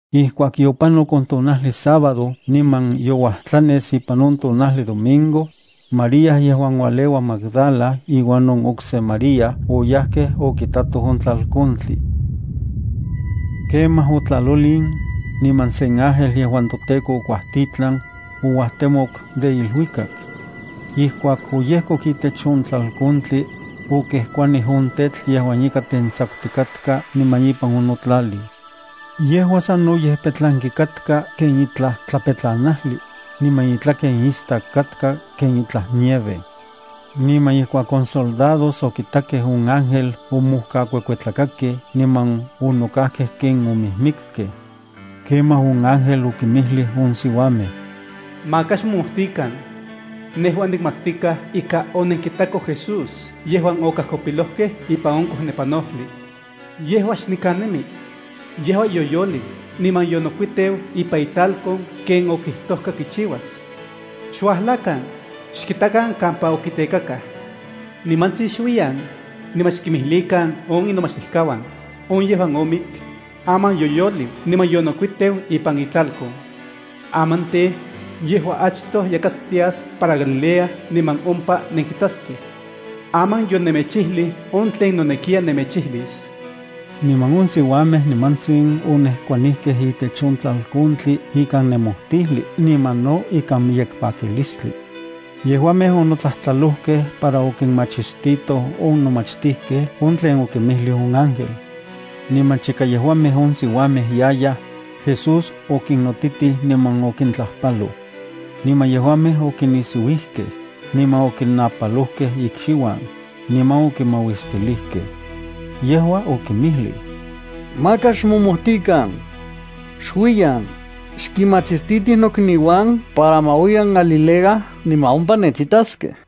Ijkuak yopanok on tonajli sábado niman youajtlanes ipan on tonajli domingo, María yejuan ualeua Magdala iuan on okse María oyajkej okitatoj on tlalkontli. Kemaj otlalolin, niman sen ángel yejuan toTEKO okuajtitlan, ouajtemok de iluikak. Ijkuak oyejkok itech on tlalkontli, okejkuanij on tetl yejuan ika tentsakutikatka niman ipan onotlalij. Yejua sanoyej petlanki katka ken itlaj tlapetlanajli, niman itlaken istak katka ken itlaj nieve. Niman ijkuak on soldados okitakej on ángel, omojkakuekuetlakakej niman onokajkej ken omijmikkej. Kemaj on ángel okinmijlij on siuamej: —Maka xmomojtikan. Nejua nikmatstikaj ika onenkitakoj Jesús yejuan okajkopilojkej ipan on kojnepanojli. Yejua xnikan nemi. Yejua yoyoliu niman yonokuiteu ipan itlalkon ken okijtojka kichiuas. Xuajlakan, xkitakan kampa okitekakaj. Nimantsin xuiyan, niman xkimijlikan on inomachtijkauan: “On yejuan omik, aman yoyoliu niman yonokuiteu ipan itlalkon. Aman tej, yejua achtoj yas yakatstias para Galilea niman ompa nenkitaskej.” Aman yonemechijlij on tlen nonekiya nemechijlis. Niman on siuamej nimantsin onejkuanijkej itech on tlalkontli ikan nemojtijli niman no ikan miyek pakilistli. Yejuamej onotlajtlalojkej para okinmachistitoj on nomachtijkej on tlen okinmijlij on ángel. Niman chika yejuamej on siuamej yayaj, Jesús okinnotitij niman okintlajpaloj. Niman yejuamej okinisiuijkej, niman okinapalojkej ikxiuan, niman okimauistilijkej. Yejua okinmijlij: —Maka xmomojtikan. Xuiyan, xkinmachistitij nokniuan para ma uiyan Galilea, niman ompa nechitaskej.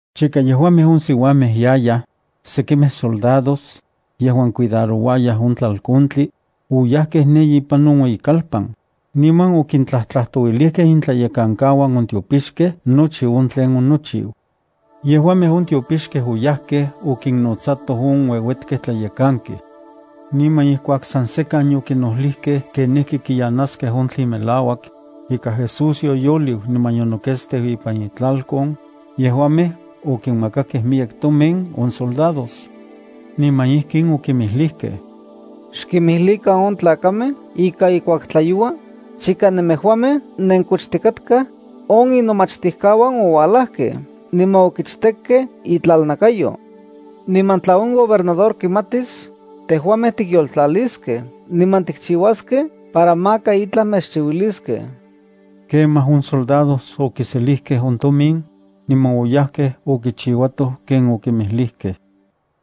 Chika yejuamej on siuamej yayaj, sekimej soldados, yejuan cuidarouayaj on tlalkontli, oyajkej ne ipan on ueyikalpan, niman okintlajtlajtouilijkej intlayekankauan on tiopixkej nochi on tlen onochiu. Yejuamej on tiopixkej oyajkej okinnotsatoj on ueuetkej tlayekankej. Niman ijkuak san sekan yokinojlijkej kenijki kiyanaskej on tlen melauak ika Jesús oyoliu niman yonoketsteu ipan itlalkon, yejuamej okinmakakej miyek tomin on soldados. Niman ijkin okinmijlijkej: —Xkimijlikan on tlakamej ika ijkuak tlayoua, chika nemejuamej nenkochtikatkaj, on inomachtijkauan oualajkej niman okichtekkej itlalnakayo. Niman tla on gobernador kimatis, tejuamej tikyoltlaliskej niman tikchiuaskej para maka itlaj mechchiuiliskej. Kemaj on soldados okiselijkej on tomin, niman oyajkej okichiuatoj ken okinmijlijkej.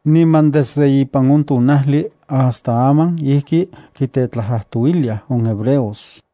Niman desde ipan on tonajli hasta aman ijki kitetlajtlajtouiliaj on hebreos.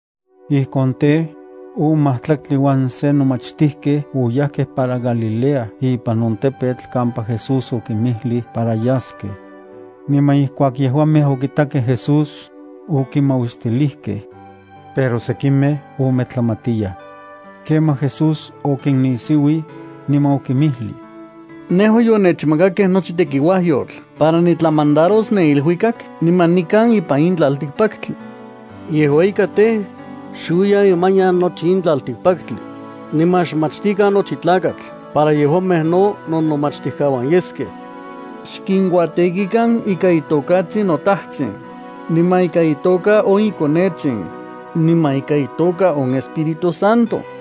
Ijkon tej, on majtlaktli uan se nomachtijkej oyajkej para Galilea ipan on tepetl kampa Jesús okinmijlij para yaskej. Niman ijkuak yejuamej okitakej Jesús, okimauistilijkej. Pero sekimej ometlamatiyaj. Kemaj Jesús okinnisiuij, niman okinmijlij: —Nejua yonechmakakej nochi tekiuajyotl para nitlamandaros ne iluikak niman nikan ipan in tlaltikpaktli. Yejua ika tej, xuiyan imanian nochi in tlaltikpaktli, niman xmachtikan nochi tlakatl para yejuamej no nonomachtijkauan yeskej. Xkinkuatekikan ikan itokatsin noTajtsin, niman ikan itoka on iKonetsin, niman ikan itoka on Espíritu Santo.